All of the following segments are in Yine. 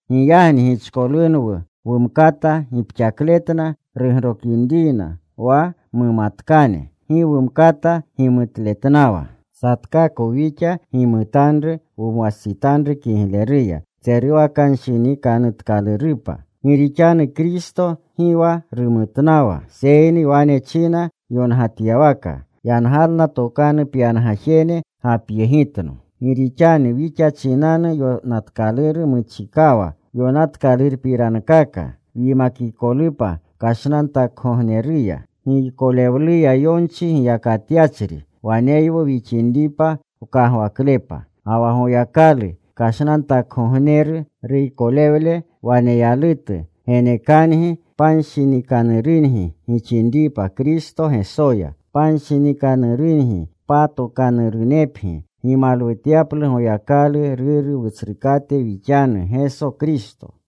Giyagni gichkolunwu wumkata gipxakletna rugrokinriyna wa mumkatkane. Gi wumkata gimutletnawa. Satkakwu wixa gimutanru wumwastsitanru kigleruya tseruwakanshinikanutkalurupa. Gi rixanu Kristo gi wa rumutnawa. Seyni wane china yongatyawaka: “Yangalna tokanu pyangajene gapyegitno.” Gi rixanu wixa chinanu yonatkaluru muchikawa yonatkalurpirankaka wyimakikolupa kashnantakgogneruya, giykolewluya yonchi giyakatyachri waneywu wixinripa wkagwaklepa. Ga wa Goyakalu kashnantakgogneru, ruykolewle waneyalutu, genekangi panshinikanurungi gixinripa Kristo Gesoya. Panshinikanurungi patokanurunepgi gimalwutyaplu Goyakalu Ruru Wutsrukate wixanu Geso Kristo.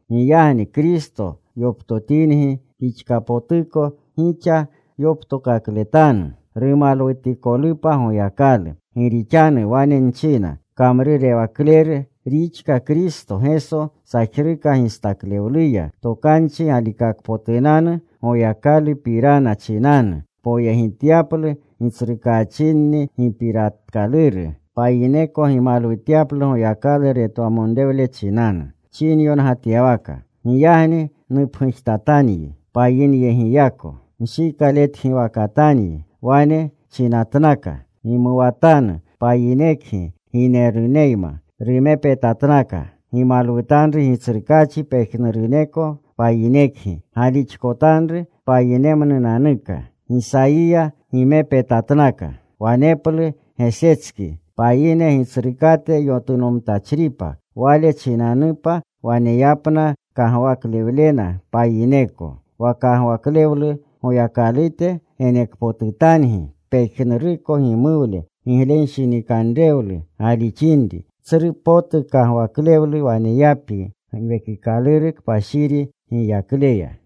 Giyagni Kristo yoptotingi pixkapotuko, gixa yoptokakletanu, rumalwutikolupa Goyakalu. Gi rixanu wane nchina, kamrurewakleru rixka Kristo Geso sajruka gistaklewluya, tokanchi galikakpotunanu Goyakalupirana chinanu, poyegityaplu gitsrukaachinni gipiratikaluru. Payineko gimalwutyaplu Goyakalu retwamonrewle chinanu. Chinyongatyawaka: Giyagni nupgujtatanyi payinyegiyako. Nshikaletgiwakatanyi. Wane chinatnaka: Gimuwatanu, payinekgi, gineruneyma. Rumepetatnaka: Gimalwutanru Gitsrukaachi pejnuruneko payinekgi. Galixkotanru, payinemnunanuka. Gisayiya gimepetatnaka: Waneplu Gesetski, payine Gitsrukate yotunomtachripa. Wale chinanupa waneyapna kagwaklewlena payineko. Wa kagwaklewlu Goyakalute genekpotutangi pejnuruko gimuwlu giglenshinikanrewlu galixinri. Tsru potu kagwaklewlu waneyapgi Giwekikaluru Kpashiri giyaklewleya.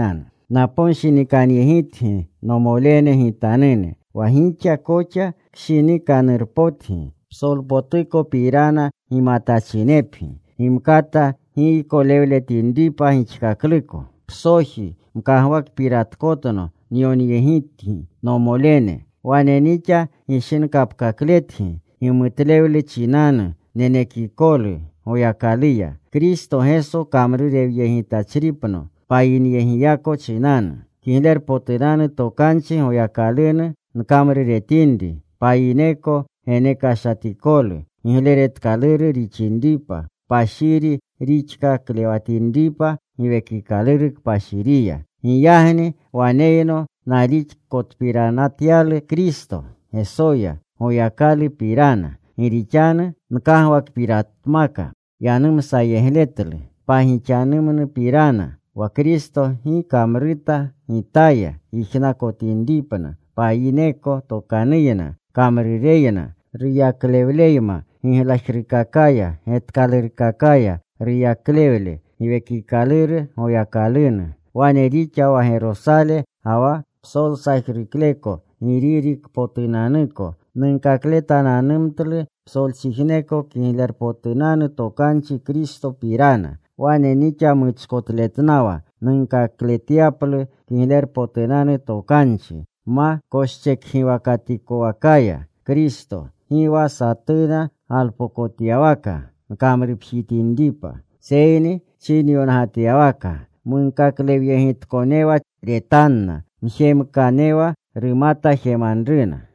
Naponshinikanyegitgi, nomolene gitanune, wa gixa koxa kshinikanurunpotgi, psolpotukopirana gimatachinepgi, gimkata giykokakletinripa gixkakluko. Psoji mkagwakpiratkatno nyonyegitgi, nomolene, wane nixa gishinkapkakletgi, gimutlewlu chinanu nenekikolu Goyakaluya. Kristo Geso kamrurewyegitachripno payineyegiyako chinanu, Kiglerpotunanu Tokanchi Goyakalunu nkamruretinri. Payineko genekashatikolu gigleretkaluru rixinripa, kpashiri rixkaklewatinripa Giwekikaluru Kpashiriya. Giyagni waneyno nalixkotpiranatyalu Kristo Gesoya Goyakalupirana. Gi rixanu nkagwakpiratmaka yanumsayegletlu pagixanu pirana wa Kristo gi kamruta gitaya yijnakotinripna payineko tokanuyna, kamrureyna, ruyaklewleyma giglajrukakaya, getkalurkakaya, ruyaklewle Giwekikaluru Goyakalunu. Wane rixa wa Gerosale ga wa psolsajrukleko Giririkpotunanuko nunkakletananumtlu psolchijneko Kiglerpotunanu Tokanchi Kristopirana. Wane nixa muchkotletnawa nunkakletyaplu Kiglerpotunanu Tokanchi, ma koschekgiwakatikowakaya Kristo, gi wa satuna galpokotyawaka nkamrupjitinripa. Seyni chinyongatyawaka: Munkaklewyegitkonewa retanna. Mjemkanewa rumata jemanruna.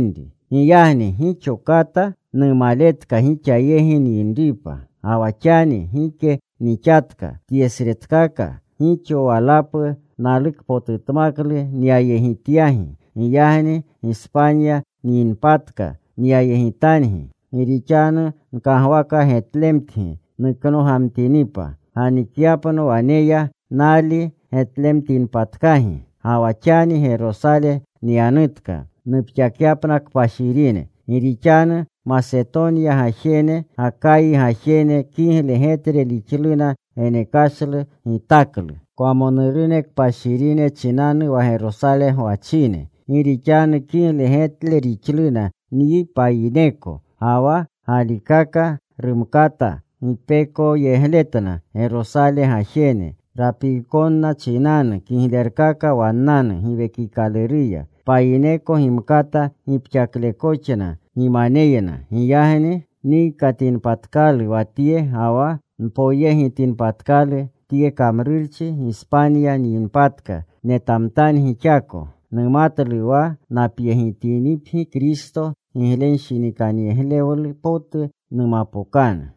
Giyagni gixo kata numaletka gixa yegi nyinripa. Ga wa xani gike nixatka tyesretkaka. Gixo walapu nalukpotutmaklu nyayegityagi. Giyagni Gispanya nyinpatka, nyayegitangi. Gi rixanu nkagwaka getlemtgi nuknogamtinipa, ganikyapno waneya, nali getlemtinpatkagi. Ga wa xani Gerosale nyanutka nupxakyapna kpashirine. Gi rixanu Masetonya gajene, Gakayi gajene kigle getle rixluna genekashlu gitaklu kwamonurune kpashirine chinanu wa Gerosale gwachine. Gi rixanu kigle getle rixluna nyi payineko. Ga wa galikaka rumkata gipekooyegletna Gerosale gajene, rapikonna chinanu kiglerkaka wannanu Giwekikaluruya. Payineko gimkata gipxaklekoxna gimaneyna. Giyagni nnikatinpatkalu wa tye ga wa npoyegitinpatkalu tye kamrurchi, Gispanya nyinpatka, netamtangi xako. Numatlu wa napyegitinipgi, Kristo giglenshinikanyegle potu numapokanu.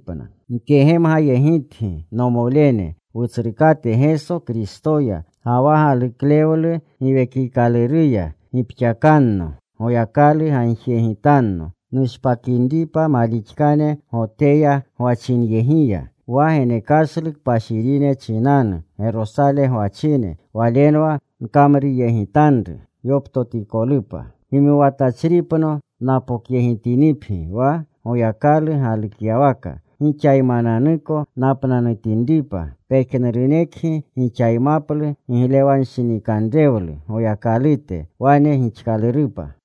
Nkegemgayegitgi, nomolene, Wutsrukate Geso Kristoya, ga wa galuklewlu Giwekikaluruya, gipxakanno. Goyakalu gagjiyegitanno, nushpakinripa malixkane Goteya gwachinyegiya; wa genekashlu kpashirine chinanu Gerosale gwachine, walenwa nkamruyegitanru, yoptotikolupa. Gimuwatachripno napokyegitinipgi wa Goyakalu galukyawaka, gixaymananuko napnanutinripa. Pejnurunekgi gixaymaplu giglenshinikanrewlu Goyakalute. Wane gixkalurupa.